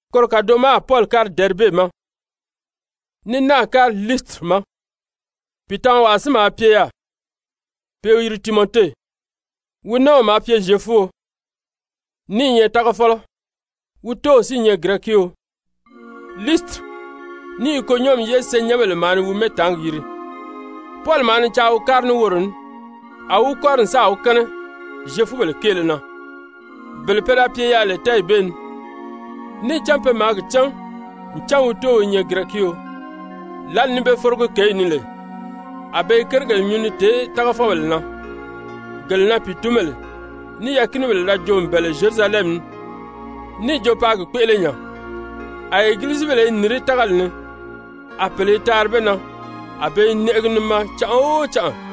Koro kàdoʔo ma a Pɔli kári Dɛribe ma, ní náà kári Liisitiri ma. Pìitamawaa si maa pye yaà pe i wi yiri Timɔte, wi nɔ́ɔw maa pye Zyefuo, ní i nyɛ tágafɔlɔ, wi tóow si i nyɛ Girɛkio. Liisitiri ní Ikonyɔmi ye senyɛnbèle maa ni wi mɛ́ɛtaangi yiri. Pɔli maa ni caa wi kári ní woro ní. A wi wi kɔ́ri n sáà wi kɛ́nɛ Zyefubèle kéele na, bele pe da pye yaà lè tɛ́ɛyi bee ni, níì cán pe myɛ maa gi cán ncan wi tóow i nyɛ Girɛkio. Lǎli ni be forogi kěyi ni lè, a be i kérigèle nyuu ni tèé tágafɔbèle na, gele na pìitunbèle ní yɛɛ̀kinibèle da joo n bɛ̀ɛ lè Zyerusalɛmi ni níì jo paa gi kpéʔele nya. A egilizibèle i nìrí tágali ni, a pèle i taari be na, a be i nɛʔɛgi ni maa canʔa o canʔa.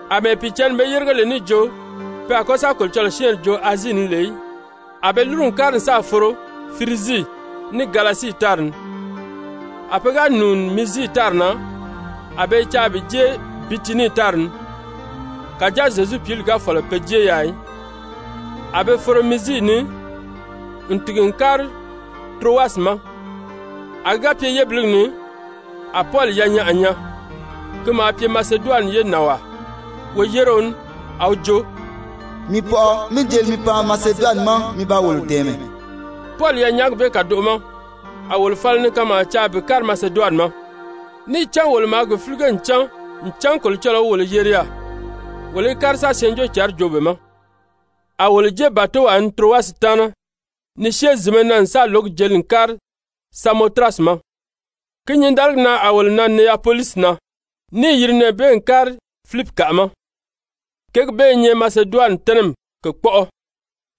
Amɛɛ Pìicǎnni be yérige lè níì jo pe a kɔ́ sa Kolocɔlɔɔ syɛ́ɛnri joo Azii ni lè í, a be lúru n kári n sáà foro Firizii, ní Galasii tári ni. A pe ga nùuni Mizii tári na, a be i caa bi jée Bitinii tári ni. Kàjáa Zyezu Pǐli ga fɔ̀lɔ pe jée yaà í. A be foro Mizii ni n tìgi n kári Turowasi ma. A ki ga pye yébiligi ni, a Pɔli yanyaʔa nyaa, ki maa pye Maseduwani ye nànwaa, woyéreo ní, a wi jo: «Mii pɔʔɔ, mí jeli mi pan Maseduwani ma mi ba wolo dɛ̀ɛmɛ!» Pɔli yanyaagi bee kàdoʔo ma a wolo fala ni kanmaa caa bi kári Maseduwani ma, níì cán wolo maa gi fílige n cán ncan Kolocɔlɔɔ wi wolo yeri yaà, wolo í kári sa Syɛɛnjóocǎnri joo be ma. A wolo jée bàtowaa ni Turowasi taana ni syée zìnmɛ na n lǒgi jeli n kári Samotirasi ma, ki nyǐndaligi na a wolo nan Neyapolisi na, níì yiri nɛɛ bee n kári Filipikaʔa ma, kěgi bee i nyɛ Maseduwani tɛ́nɛmi kèkpɔʔɔ,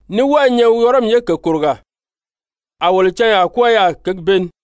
ní wɔ́ɔ i nyɛ Wɔrɔmi ye kèkòrogaa. A wolo canyaa kwɔ́ɔ yaà kěgi bee ni.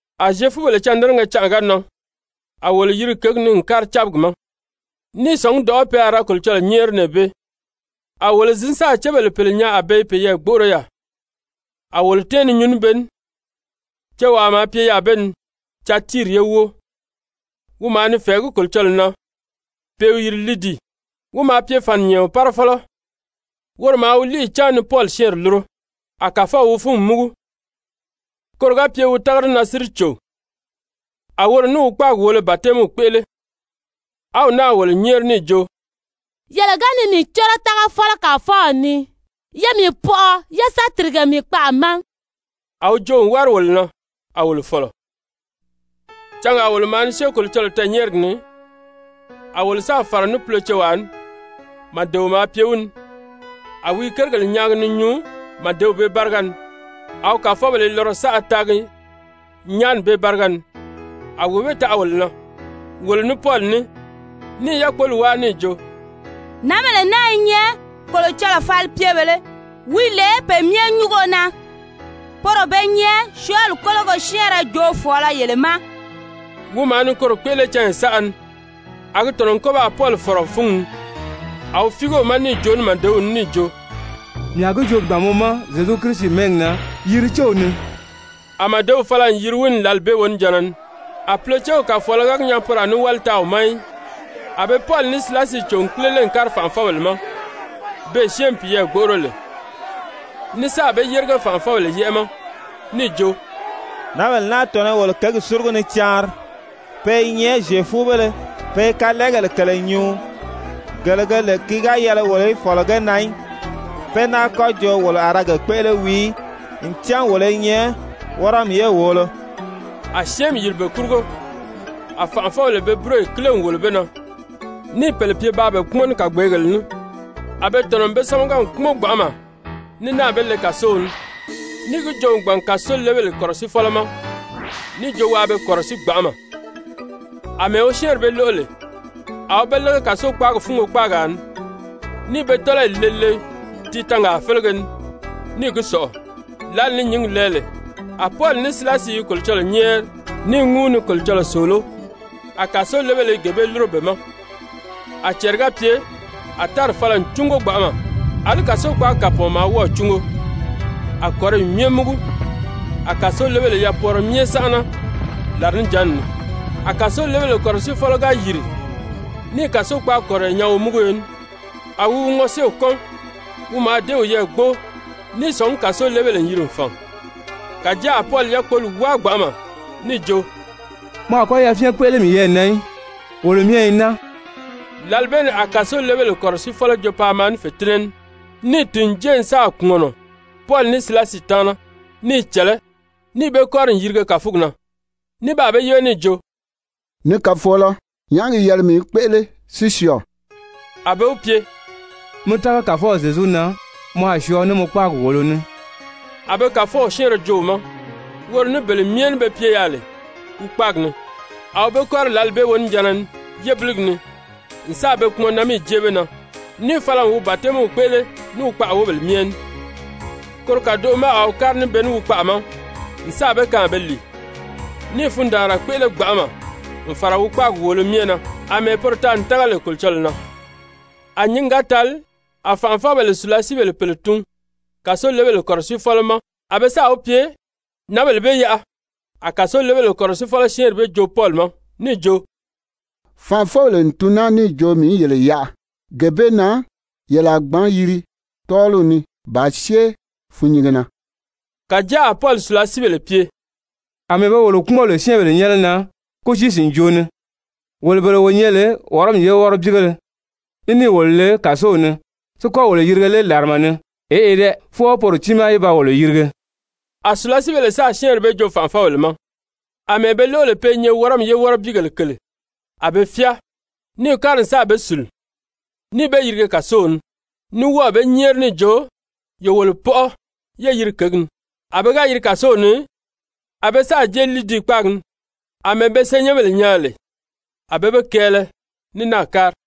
A Zyefubèle cândɛnɛgɛ canʔa ga nan, a wolo yiri kěgi ni n kári cábigi ma, ní i sɔ̀ngí dɔ̀ʔɔ́ pe a ra Kolocɔlɔɔ nyɛ́ɛri nɛɛ bee. A wolo zǐn sáà cébèle pèle nyaa a be i peyɛɛ gbóʔoro yaà, a wolo tɛ́ɛn ni nyuu ní be ní. Cewaa maa pye yaà be ni Tyatiiri ye wóo, wi maa ni fɛ̀ɛgí Kolocɔlɔɔ na pe i wi yiri Lidii. Wi maa pye fàninyɛɛɔn fàninyɛɛɔn: Fàninyɛɛnw bee félege maa pye màsaabèle woleo. párafɔlɔ. Woro maa wi líiyi cáan ni Pɔli syɛ́ɛnri lúro, a Kàfɔw wi fúngi múgu, koro ga pye wi tága di na si di cò. A woro ní wi kpáagi wòolo batɛmiw kpéʔele, a wi náà wolo nyɛ́ɛri níì jo: «Yele ga ni mii córo tágafɔlɔ Kàfɔw ni, ye mii pɔʔɔ, yé sa tìrige mii kpaʔa ma.» A wi joo n wári wolo na, a wolo fɔ̀lɔ. Cangaa wolo maa ni syée Kolocɔlɔɔ tɛɛ̀nyɛɛrigi ni, a wolo sáà fàra ní pulocewaa ní, màdeo maa pye wi ni a wi i kérigèle nyaagi ni nyuu màdew bee báriga ni, a wi kàfɔbèle i lɔrɔ saʔa taagi nyaani bee báriga ni. A wee bee taʔa wolo na, wolo ní Pɔli ní, ní i yákpoli wáa níì jo: «Nǎnbèle naa i nyɛ Kolocɔlɔw falipyebèlē wi lè Pe Myɛ Nyúngo na, poro be nyɛ syɔɔli kólogo syɛ́ɛnrɛ joofɔɔlɔ yele ma.» Wi maa ni koro kpéʔele canya saʔa ni. A gi tɔ̀nɔ n kɔ́ baa Pɔli fɔ̀rɔ fúngi ni, a wi fíige wi ma níì joo ní màdew ní níì jo: «Mii a gi joo gbàn mɔ ma Zyezu Kirisi mɛ́ɛgi na, yiri céw ni.» A màdew fala n yiri wi ni lǎli bee wonijanna ni. A pulocew kàfɔɔlɔ ga gi nyaa poro a ní wáli taa wi ma í, a be Pɔli ní Silasi cò n kílele n kári fànʔafɔbèle ma, beè syɛ́ɛnmi piyɛɛ gbóʔoro lè. Ní sáà be yérige fànʔafɔbèle yɛ́ʔɛ ma níì jo: «Nǎnbèle naa tɔ̀nɔ i wolo kěgi súrugu ni caanri. Pe i nyɛ Zyefubéle. Pe i kalɛɛgèle kèle nyuu, gele ge lè ki ga yɛlɛ wolo í fɔ̀lɔ ge na í, pé náa kɔ́ jo wolo a ra ge kpéʔele wii í. Ncan wolo i nyɛ Wɔrɔmi ye wòolo.» A syɛ́ɛnmi yìri be kurugo. A fànʔafɔbèle be búroyi kíle n wòlo be na níì pèle pye paa be kpúmɔn ní kàgbeegèle ní. A be tɔ̀nɔ n be sámaga n kpúmɔn gbanʔama ní náà be le kàsow ni níì gi joo n gbàn kàsolebèle kɔ̀rɔsiifɔlɔ ma níì jo waa be kɔ̀rɔsíi gbanʔama. Amɛɛ wi syɛ́ɛnri bee lóʔo lè, a wi be lége kàsokpaagi fúngo kpaagaa ni, níì be tɔ́lɔyi le le tiitangaa félege ni níì gi sɔ̀ʔɔ. Lǎli ni nyǐngi lɛɛ lè, a Pɔli ní Silasi i Kolocɔlɔɔ nyɛ́ɛri, ní i ŋúu ni Kolocɔlɔɔ sòoló, a kàsolebèle i gee bee lúro be ma. A cɛɛri ga pye, a tári fala n cúngo gbanʔama, àlí kàsokpaagi kàpɔɔn maa wɔ́ɔ̀ cúngo, a kɔ̀riyi myɛ múgu, a kàsolebèle yapwɔɔrɔ myɛ sánʔana làrinijanni ni. A kàsolebèle kɔ̀rɔsiifɔlɔ ga yìri níì kàsokpaagi kɔ̀riyɔ nyaa womúguyo ní, a wi wi ŋɔséew kɔ́n. Wi mǎà dée wiyɛɛ gbóo ní i sɔ̀ngí kàsolebèle n yiri n fàn. Kàjáa a Pɔli yákpoli wáa gbanʔama níì jo: «Mɔ a kɔ́ yafyɛn kpéʔele miyɛɛ na í, wolo myɛ i naa.» Lǎli bee ni a kàsolebèle kɔ̀rɔsiifɔlɔ jo paa maa ní fètinnɛ ní, níì tìn n jée n sáà kpùmɔnɔ Pɔli ní Silasi taana, ní i cɛ̀lɛ́, níì be kɔ́ri n yirige kàfugi na ní baa be yíbe níì jo: «Ni kàfɔɔlɔ, nyàʔá gi yɛlɛ mii í kpéʔele si syɔɔ?» A be wi pye: «Mi tága Kàfɔw Zyezu na, mɔ a syɔɔ ní mɔ kpáagi wòolo ní.» A be Kàfɔw syɛ́ɛnrɛ joo wi ma, woro ní bele myɛ ní be pye yaà lè wi kpáagi ni. A wi be kɔ́ri lǎli bee wonijanna ni yébiligi ni n sáà be kpumɔnnamiyi jée be na, níì fala n wi batɛmiw kpéʔele ní wi wóbèle myɛ ní. Koro kàdoʔo ma a wi kári ní be ní wi kpaʔa ma n sáà be kaan a be lìi, ní i fundaanra kpéʔele gbanʔama n fàra wi kpáagi wòolo myɛ na, àmɛɛ poro taa n tága lè Kolocɔlɔɔ na. A nyǐngi ga tali, a fànʔafɔbèle sùlasiibèle pèle tun kàsolebèle kɔ̀rɔsiifɔlɔ ma a be sáà wi pye: «Nǎnbèle bee yaʔa.» A kàsolebèle kɔ̀rɔsiifɔlɔ syɛ́ɛnri bee joo Pɔli ma níì jo: «Fànʔafɔbèle n tun naa níì jo mii í yele yaʔa. Gee bee na yele a gbǎn yiri tɔ́ɔliw ni bàā syée fûnnyinge na.» Kàjáa a Pɔli sùlasiibèle pye: «Amɛɛ be wolo kpúmɔn lè syɛ́ɛnbèle nyɛ́nɛ na kútii-sìnjoo ni, wolo bele wo nyɛ lè Wɔrɔmi ye wɔ́rɔbiigéle, ní níì wolo le kàsow ni, si kɔ́ wolo yirige lé làrama ni? Eʔe dɛ! Fwɔɔ poro tiimaa í ba wolo yirige.» A sùlasiibèle sáà syɛ́ɛnri bee joo fànʔafɔbèle ma, àmɛɛ be lóʔo lè pe i nyɛ Wɔrɔmi ye wɔ́rɔbiigèle kèle, a be fyáa, níì kári n sáà be sùlu, níì be yirige kàsow ni, ní wɔ́ɔ̀ be nyɛ́ɛri níì jo: «Ye wolo pɔʔɔ yé yiri kěgi ni.» A pe ga yiri kàsow ni, a be sáà jée Lidii kpáagi ni, àmɛɛ be senyɛnbèle nyaa lè, a be be kɛɛlɛ, ní náà kári.